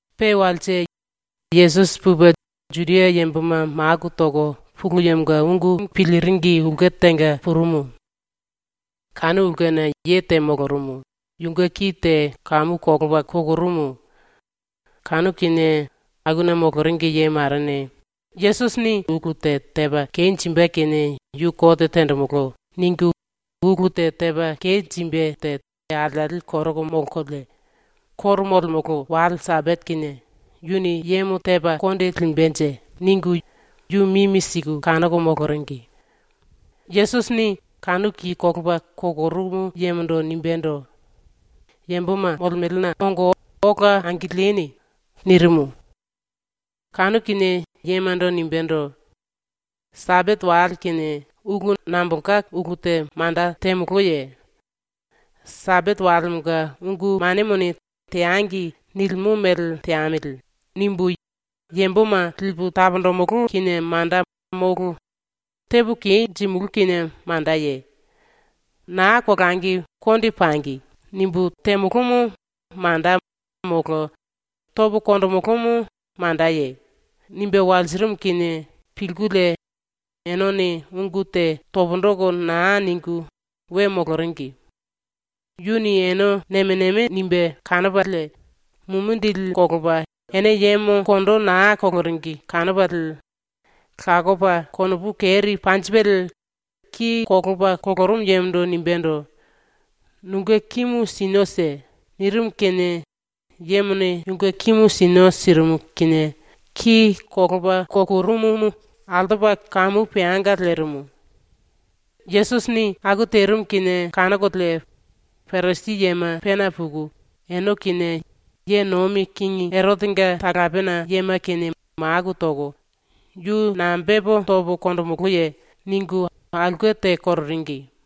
Pe walse Yesusi pupe Juda yamboma maku toko Pulu Yemonga ungu piliringi ulke tenga purumu. Kanu ulkena ye te molorumu, yunge ki te kamu kolopa kukurumu. Kanu kinie akuna moloringi ye marene ‘Yesusini ulu te tepa kenjimbe kinie yu kote tenjimulú.’ ningu ulu te tepa kenjimbe te ⸤alieli koroko molkolie⸥ ‘⸤Koro molemolo⸥ wale Sambate kinie yuni yemo tepa konde limbenje.’ ningu yu mimi siku kanoko moloringi. Yesusini kanu ki kolopa kukurumu yemondo nimbendo: “Yamboma molemelena ongo ola angilieni.” nirimu. Kanu kinie yemando nimbendo: “Sambate wale kinie ulu nambolka ulu te manda temoloye? ‘Sambate walemonga ungu manemone “Teangi.” nilimo mele teamili.’ nimbu yamboma lipu taponjimulú kinie manda molo tepo kenjimulú kinie mandaye? ‘Naa kolangi konde pangi.’ nimbu temolomo manda molo topo konjimulúmu mandaye?” nimbe walsirimu kinie pilkulie enene ungu te pundu toko naa ningu we moloringi. Yuni ene nemo nemo nimbe kanopalie mumindili kolopa ene yemo kondo naa koloringi kanopalie lakopa konopu keri panjipelie ki kolopa kukurumu yemondo nimbendo: “Nunge kimu sinio si.” nirimu kinie yemone yunge kimu sinio sirimu kinie ki kolopa kukurumumu altopa kamu peanga lerimu. ⸤Yesusini aku terimu kinie kanokolie⸥ Parisi yema pena puku, ene kinie ye nomi kingi Erotenga talapena yema kinie maku toko “Yu nambe tepo topo konjimulúye?” ningu aulke te kororingi.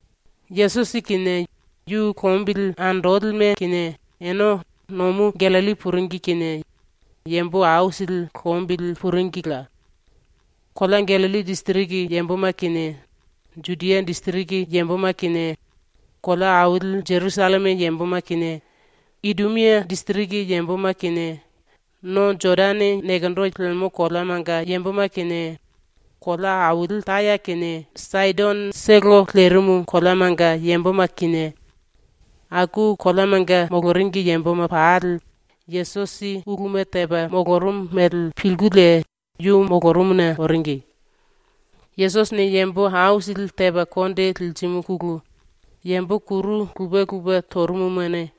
Yesusi kinie yu lombili andolime kinie ene nomu Gallilli puringi kinie yambo aisili lombili puringila. Kolea Gallilli disiriki yamboma kinie, Judia disiriki yamboma kinie, kolea aili Jerusalleme yamboma kinie, Idumia disiriki yamboma kinie, no Jodane nekendo lemo koleamanga yamboma kinie, kolea aili Taya kinie Saidonotolo lerimu koleamanga yamboma kinie, aku koleamanga moloringi yamboma pali Yesusi uluma tepa molorumu mele pilkulie yu molorumuna oringi. Yesusini yambo aisili tepa konde lirimuna yambo kuru lupe lupe torumumane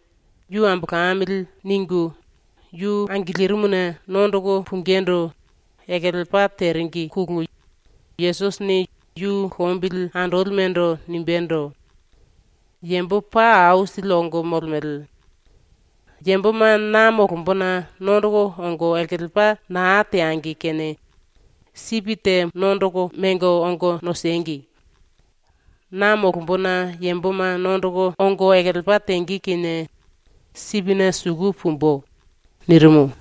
‘Yu ambolamili.’ ningu yu angilirimuna nondoko pungindu ekelepa teringine Yesusini yu lombili andolimendo nimbendo: “Yambo paa aisili ongo molemele. Yamboma na molombona nondoko ongo ekelepa naa teangi kene sipi te nondoko mengo ongo nosengi. Na molombona yamboma nondoko ongo ekelepa tenge kinie sipine suku pumbu.” nirimu.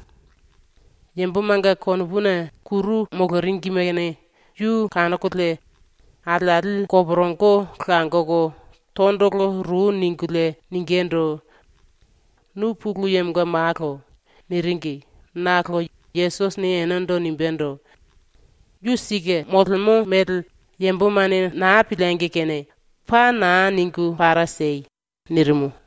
⸤Yambomanga konopuna⸥ kuru moloringimene yu kanokolie alieli koporongo langoko tondolo ru ningulie ningindu: “Nu Pulu Yemonga Malo.” niringi nakolo Yesusini enendo nimbendo: “Yu ⸤sike⸥ molemo mele ⸤yambomane naa piliengi kene⸥ paa naa ningu para siei!” nirimu.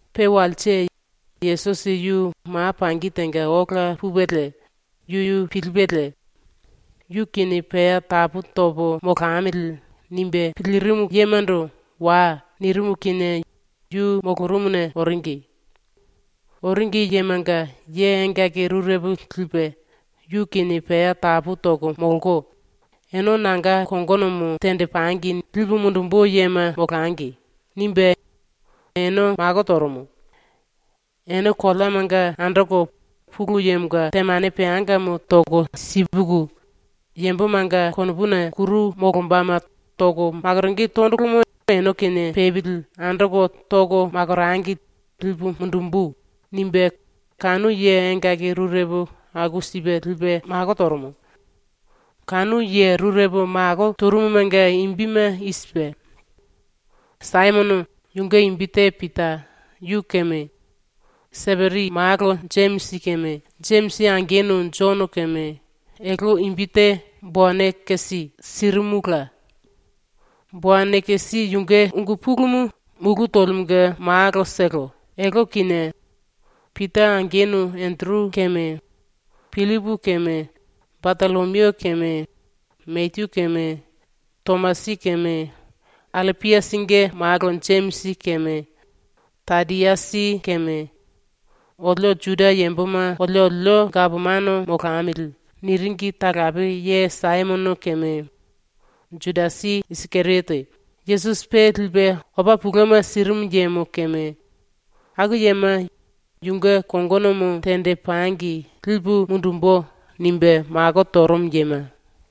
⸤Pe walse⸥ Yesusi yu ma pangi tenga ola pupelie yuyu pilipelie ‘yu kinie pea tapu topo molamili.’ nimbe pilirimu yemando “Wai.” nirimu kinie yu molorumuna oringi. Oringi yemanga ye engaki rurepo lipe, yu kinie pea tapu toko molko, “Ene nanga kongonomo tenjipangi lipu mundumbu yema molangi.” nimbe ene mako torumu. ‘Ene koleamanga andoko Pulu Yemonga temane peangamo toko sipuku, yambomanga konopuna kuru molombama toko makoronge tondolomo ene kinie pepili andoko toko makorangi lipu mundumbu.’ nimbe kanu ye engaki rurepo aku sipe lipe mako torumu. Kanu ye rurepo mako torumumanga imbime i sipe: Saimono (yunge imbi te Pita) yu keme, Seperi malo Jemisi keme, Jemisi angenu Jono keme, (elte imbi te Boanekesi sirimula. Boanekesi yunge ungu pulumu mulú tolimunge malotolo.) elte kinie, ⸤Pita angenu⸥ Enderu keme, Pillipu keme, Batollomiu keme, Mateyu keme, Tomasi keme, Allapiasinge malo Jemisi keme, Tadiasi keme, “Olio Juda yamboma oliolio gapomano molamili.” niringi talape ye Saimono keme, Judasi Isikeriote, Yesusi pe lipe opa touma sirimu yemo keme, ⸤aku yema ‘yunge kongonomo tenjipangi lipu mundumbu.’ nimbe mako torumu yema⸥.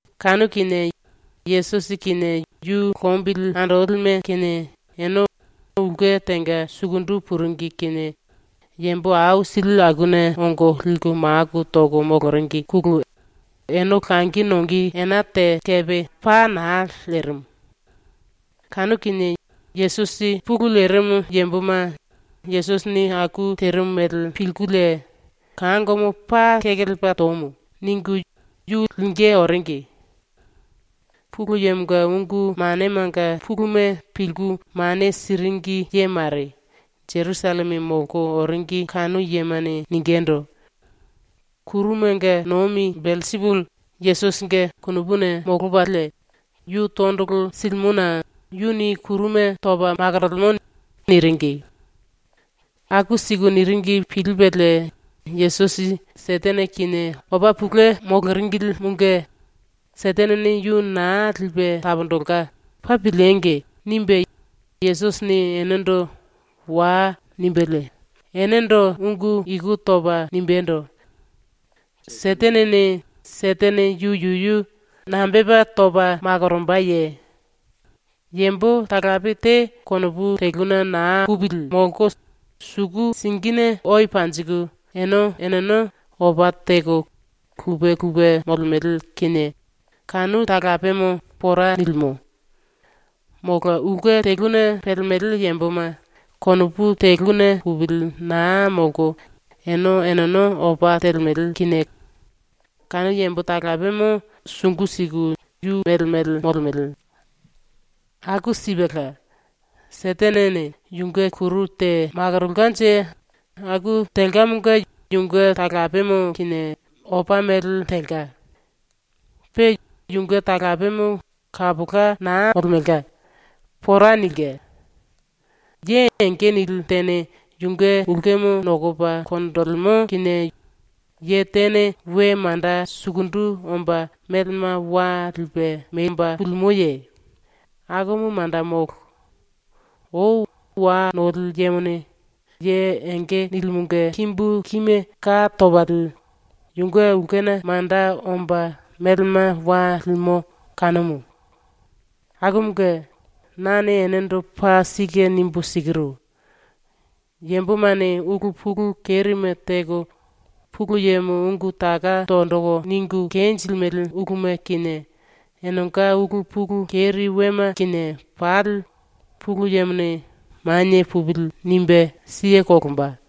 Kanu kinie Yesusi kinie yu lombili andolime kinie ene ulke tenga sukundu puringi kinie yambo aisili akuna ongo liku maku toko moloringine ene langi nonge ena te kepe paa naa lerimu. Kanu kinie Yesusi pulu lerimu yamboma ⸤Yesusini aku terimu mele⸥ pilkulie “Kangomo paa kekelepa tomu.” ningu yu lingí oringi. Pulu Yemonga ungu manemanga puluma pilku mane siringi ye mare Jerusalleme molko oringi kanu yemane ningindu: “Kurumanga nomi Belsipuli Yesusinge konopuna molopalie yu tondolo silimona yuni kuruma topa makorolemo.” niringi. Aku siku niringi pilipelie ⸤Yesusi Setene kinie opa tou moloringilimunge ‘Setenene yu naa lipe taponjilke paa piliengi!’ nimbe⸥ Yesusini enendo “Wai.” nimbelie enendo ungu iku topa nimbendo: “Setenene Setene yuyu nambe tepa topa makorombaye? Yambo talape te konopu teluna naa pupili molko suku singine owe panjiku ene eneno opa teko lupe lupe molemele kinie kanu talapemo pora nilimo. ⸤Molo⸥ ulke teluna pelemele yamboma konopu teluna pupili naa molko ene eneno opa telemele kinie kanu yambo talapemo sungu siku yu mele mele molemele. Aku sipela, Setenene yunge kuru te makorolkanje aku telkamonga yunge talapemo kinie opa mele telka. Pe yunge talapemo kapola naa molemelka. Pora nilke. “Ye enge nili tene yunge ulkemo nokopa konjilimo kinie ye tene we manda sukundu omba melema wa lipe memba pulimoye? Akumu manda molo. Ou wa noli yemone ye enge nilimunge kimbu kime ka topalie yunge ulkena manda omba melema wa limo kanumu. “⸤Akumunge⸥ nane enendo paa sike nimbu sikiru: Yambomane ulu pulu kerime teko ⸤Pulu Yemo⸥ ungu taka tonjiku ningu kenjilimele uluma kinie, enenga ulu pulu keri wema kinie pali ⸤Pulu Yemone⸥ ‘Manie pupili.’ nimbe siye kolomba.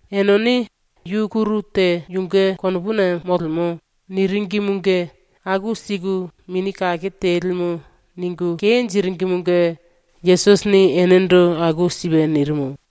Enene “Yu kuru te yunge konopuna molemo.” niringimunge ⸤aku siku Mini Kake Telimu ningu kenjiringimunge⸥ Yesusini enendo aku sipe nirimu.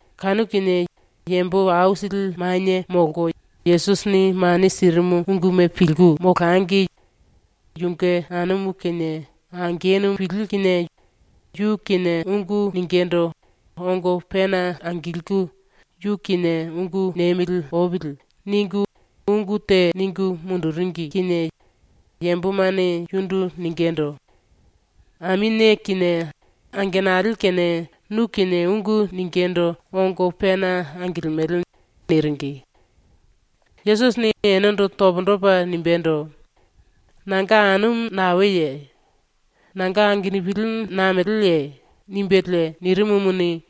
Kanu kinie yambo aisili manie ⸤molko⸥ Yesusini ⸤mane sirimu unguma pilku⸥ molangi yunge anumu kinie angenupili kinie yu kinie ungu ningindu ongo pena angilku “Yu kinie ungu niemili opili.” ningu ungu te ningu munduringi kinie yambomane yundu ningindu: “Aminie kinie angenali kinie nu kinie ungu ningindu ongo pena angilimele.” niringi. Yesusini enendo pundu topa nimbendo: “Nanga anumu naeye? Nanga angenupili nameleye?” nimbelie nirimumuni,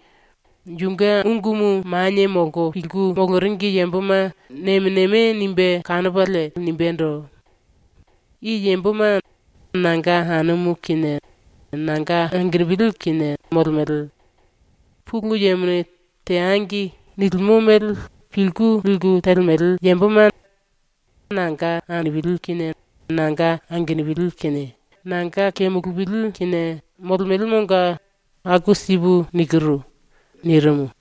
yunge ungumu manie molko pilku moloringi yamboma nemo nemo nimbe kanopalie nimbendo: “I yamboma nanga anumu kinie nanga angenupili kinie molemele. Pulu Yemone “Teangi” nilimo mele pilku liku telemele yamboma nanga anumu kinie nanga angenupili kinie nanga kemulupili kinie molemelemonga aku sipu nikiru.” nirimu.